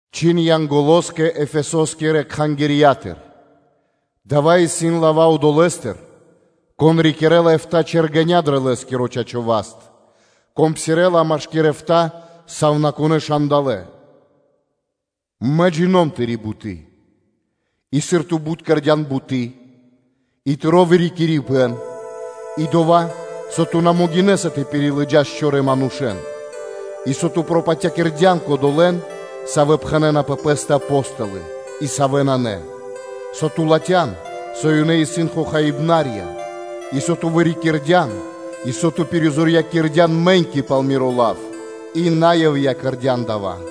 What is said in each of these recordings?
Чхин Янголоскэ Эфесоскирэ кхангирья́тыр: “Дава́ исын лава́ Одолэ́стыр, Кон рикирэ́ла эфта́ чэргеня дро Лэ́скиро чачо́ (право) васт, Кон псирэ́ла машки́р эфта́ сувнакунэ́ момолытка: “Мэ джино́м (джина́в) Тыри́ буты́ и сыр бут ту кэрдя́н буты́, и тыро́ вырикирибэн, и дова́, со ту на могинэ́са тэ пирилыджас чорэ́ манушэ́н, и со ту пропатякирдян кодолэ́н, савэ́ пхэнэ́на пэ пэ́стэ “Апо́столы” и савэ́ нанэ, со ту латхян, со ёнэ исын хохаибнарья; и со ту вырикирдян, и со ту пиризорьякирдян мэ́ньки пал Миро лав и на ивья́ (на дармэс) кэрдя́н дава́: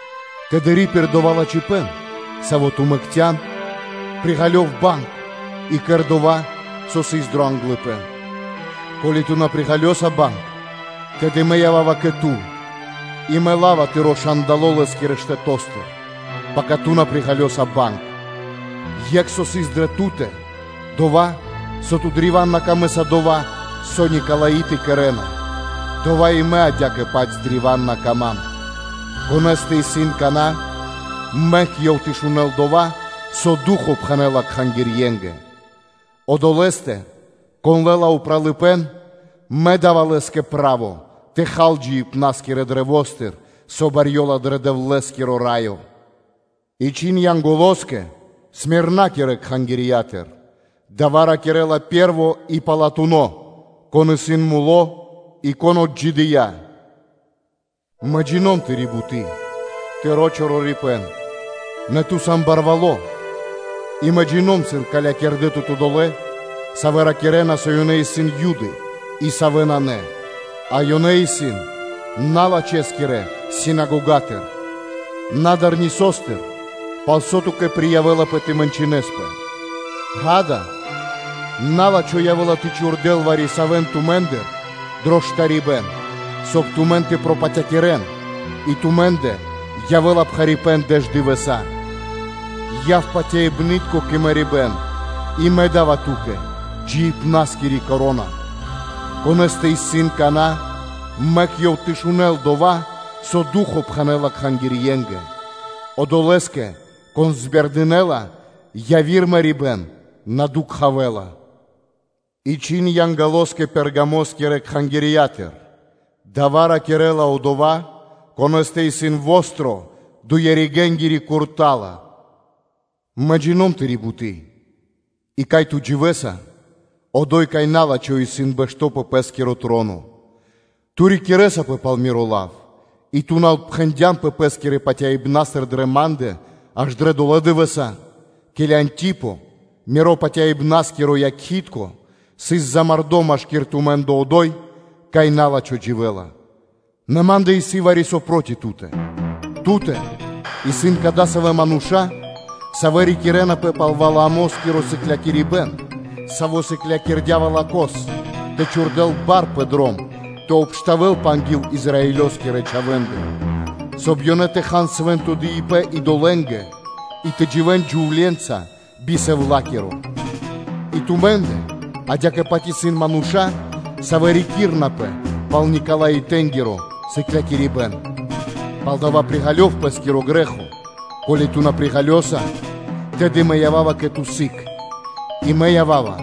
Тэды ри́пир дова́ лачхипэ́н, саво́ ту мэкцян; приґалёв банг, и кэр дова́, со ту кэрдя́н ангил дова́. Ко́ли ту на приґалёса банг, тэды Мэ ява́ва кэ ту и Мэ ла́ва тыро́ момолы́тко (свети́льнико) лэ́скирэ штэто́стыр, пака ту приґалёса банг. Екх, лачхипэн со исын дрэ ту́тэ исын, дова́, со ту́кэ древа́н исын на пир ило́ дова́, со Никалаиты кэрэ́на, дова́ и Ма́нгэ адя́кэ-паць древа́н на пир ило́. Конэ́стэ исын кана́, мэк ёв тэ шунэ́л дова́, со Ду́хо (Фа́но) пхэнэ́ла кхангирье́нгэ. Одолэ́стэ, кон лэ́ла упралыпэ́н, Мэ да́ва лэ́скэ право тэ хал джиибна́скирэ каштэ́стыр (дрэвостыр), со барьёла дро Дэвлэ́скиро Раё.” И чхин Янголоскэ Смирнакирэ кхангирья́тыр: “Дава́ ракирэ́ла Пэ́рво и Палатуно́, Кон исын муло́ и Кон отджидыя́: Мэ джино́м (джина́в) тырэ́ рэ́нды (де́лы), тыро́ калыпэ́н (ту́га), нэ ту сан барвало́ и Мэ джино́м (джина́в), сыр калякирдэ тут одолэ́, савэ́ ракирэ́на, со ёнэ исын Юды и савэ́ нанэ, а ёнэ исын налачхэскирэ скэдынятыр (скедыибнастыр). На дар нисостыр, пал со ту́кэ приявэлапэ тэ мэнчынэспэ. Ѓа́да, на́лачхо явэ́ла тэ чхурдэл вари-савэ́н тумэ́ндыр дро штарибэ́н (бэшыбэн); соб (кай) тумэн тэ пропатякирэн и тумэ́ндэ явэ́ла пхарипэ́н дэш дывэса́. Яв патяибны́тко кэ мэрибэ́н, и Мэ да́ва ту́кэ джиибна́скири вя́нка (коро́на). Конэ́стэ исын кана́, мэк ёв тэ шунэ́л дова́, со Ду́хо (Фа́но) пхэнэ́ла кхангирье́нгэ: Одолэ́скэ, кон пиризорьякирэла (збердынэла), яви́р мэрибэ́н на кэрэ́ла биба́хт.” И чхин Янголоскэ Пергамоскирэ кхангирья́тыр: “Дава́ ракирэ́ла Одова́, Конэ́стэ исын востро (чолало́) дуе-ригэнгири курта́ла (мечо): Мэ джино́м тыри́ буты́, и, кай ту дживэса, одо́й, кай на́лачхо исын бэшто́ пэ пэ́скиро троно. Ту рикирэсапэ пал Миро лав и ту на отпхэндянпэ пэ́скирэ патяибнастыр дрэ Ма́ндэ аж дрэ долэ́ дывэса́, ке́ли Антипо, миро патяибнаскиро якхи́тко, сыс замардо машки́р тумэ́ндэ одо́й, кай на́лачхо дживэ́ла. Нэ ма́ндэ исын вари-со проти ту́тэ; ту́тэ исын кадасавэ́ мануша́, савэ́ рикирэнапэ пал Валаамоскиро сыклякирибэ́н, саво́ сыклякирдя́ Валакос тэ чхурдэл бар пэ дром тэ обштавэлпэ анги́л Израилёскирэ чхавэ́ндэ, соб (кай) ёнэ тэ хан свэ́нто дыибэ́н идолэ́нгэ и тэ дживэ́н джувле́нца би сэвлакиро. И тумэ́ндэ адя́кэ-паць исын мануша́, савэ́ рикирэнапэ пал Никалаитэнгиро сыклякирибэ́н [саво́ мэ бидыкхава-р.с.]. Палдава́ приґалёв пэ́скиро грэ́хо: ко́ли ту на приґалёса, тэды Мэ ява́ва кэ ту сыг, и Мэ ява́ва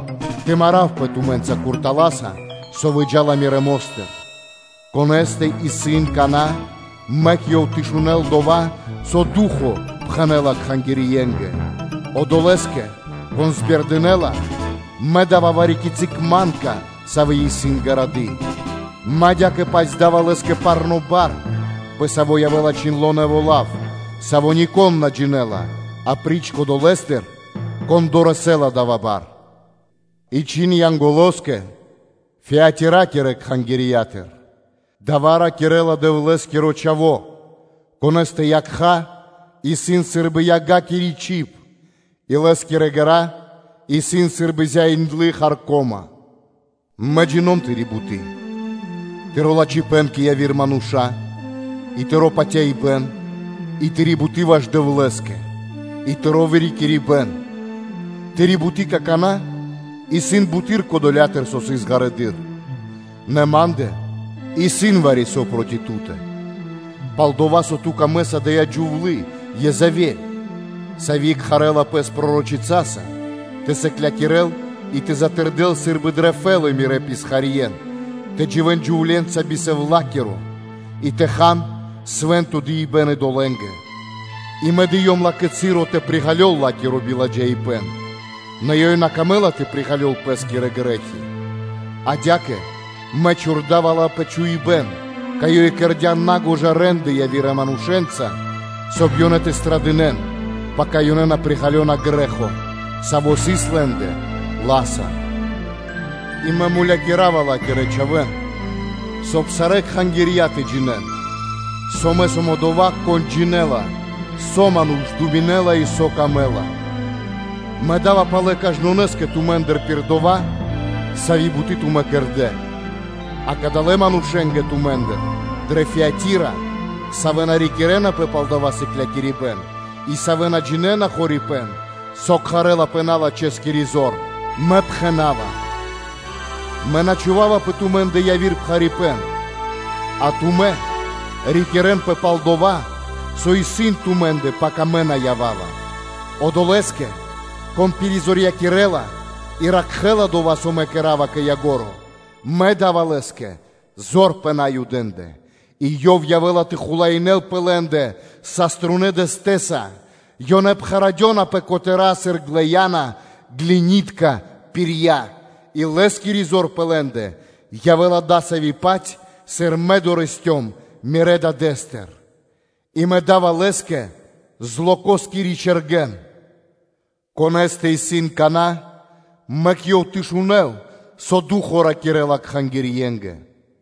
тэ маравпэ тумэ́нца куртала́са, со выджа́ла Мирэ́ мо́стыр. Конэ́стэ исын кана́, мэк ёв тэ шунэ́л дова́, со Ду́хо (Фа́но) пхэнэ́ла кхангирье́нгэ. Одолэ́скэ, кон пиризорьякэла, Мэ да́ва вари-кицы́ манка, сави́ исын гарады. Мэ адя́кэ-паць дава́ лэ́скэ парно́ бар, пэ саво́ явэ́ла чхиндло́ нэво́ лав, саво́ нико́н на джинэ́ла, апри́ч кодолэстэ, кон дорэсэ́ла дава́ бар.” И чхин Янголоскэ Фиатиракирэ кхангирья́тыр: “Дава́ ракирэ́ла Дэвлэ́скиро Чхаво́, Конэ́стэ якха́ исын сы́рбы ягакири чиб, и Лэ́скирэ ґэра́ исын сы́рбы зяиндлы харко́ма (медь): Мэ джино́м тыри́ буты́, тыро́ лачхипэ́н кэ яви́р мануша́, и тыро́ патяибэ́н и тыри́ буты́ ваш Дэвлэ́скэ, и тыро́ вырикирибэн. Тыри́ буты́ какана́ исын буты́р кодолятыр, сави́ сыс ґарэдыр (вагэды́р). Нэ Ма́ндэ исын вари-со проти ту́тэ: пал-дова́ со ту домэкэса, со ада́я джувлы́ Езавель, сави́ кхарэ́ла пэс пророчица, сыклякирэ́ла и затырдэла сы́рбы дрэ фэлы́ (петля) мирэ́ писхарье́н тэ дживэ́н джувле́нца би сэвлакиро, и тэ хан свэ́нто дыибэ́н (жэ́ртва) идолэ́нгэ. И Мэ дыём ла́кэ часо тэ приґалёл ла́киро биладжаипэ́н, нэ ёй на камэ́ла тэ приґалёл пэ́скирэ грэ́хи. Адя́кэ Мэ чхурдава ла пэ чхуибэ́н, кай ёй кэрдя́ на́гожа рэ́нды явирэ манушэ́нца, соб (кай) ёнэ тэ страдынэн, пака ёнэ приґалёна грэ́хо, саво́ сыс лэ́ндэ ла́са, и Мэ мулякирава ла́кирэ чхавэ́н, соб (кай) сарэ́ кхангирья тэ джинэ́н, со Мэ сом Одова́, Кон джинэ́ла, со ману́ш думинэ́ла, и со ёв мангэ́ла, Мэ да́ва палэ кажнонэ́скэ тумэ́ндыр пир дова́, сави́ буты́ тумэ́ кэрдэ́. А кадалэ́ манушэ́нгэ тумэ́ндыр дрэ Фиатира, савэ́ на рикирэнапэ пал дава́ сыклякирибэ́н и, савэ́ на джинэ́на хорипэ́н, со кхарэ́лапэ “налачхэскири зор”, Мэ пхэна́ва: Мэ на чхува́ва пэ тумэ́ндэ яви́р пхарипэ́н; а тумэ́ рикирэнпэ пал дова́, со исын тумэ́ндэ, пака мэ ява́ва. Одолэ́скэ, кон пиризорьякирэла и ракхэ́ла дова́, со Мэ кэра́ва кэ ко́нцо (кэ яго́ро), Мэ да́ва лэ́скэ зор пэ Наюдэ́ндэ, и ёв явэ́ла тэ хулаинэ́л пэ лэ́ндэ саструнэ́ дэстэса: ёнэ пхарадёна пэ котэра́ сыр глэяна (глинытка) пирья, и лэ́скири зор пэ лэ́ндэ явэ́ла дасави́-паць, сави́ мэ дорэсцём (долыём) Мирэ́ Дадэ́стыр, и Мэ да́ва лэ́скэ злокоскири чэргэн. Конэ́стэ исын кана́, мэк ёв тэ шунэ́л, со Ду́хо (Фа́но) ракирэ́ла кхангирье́нгэ.”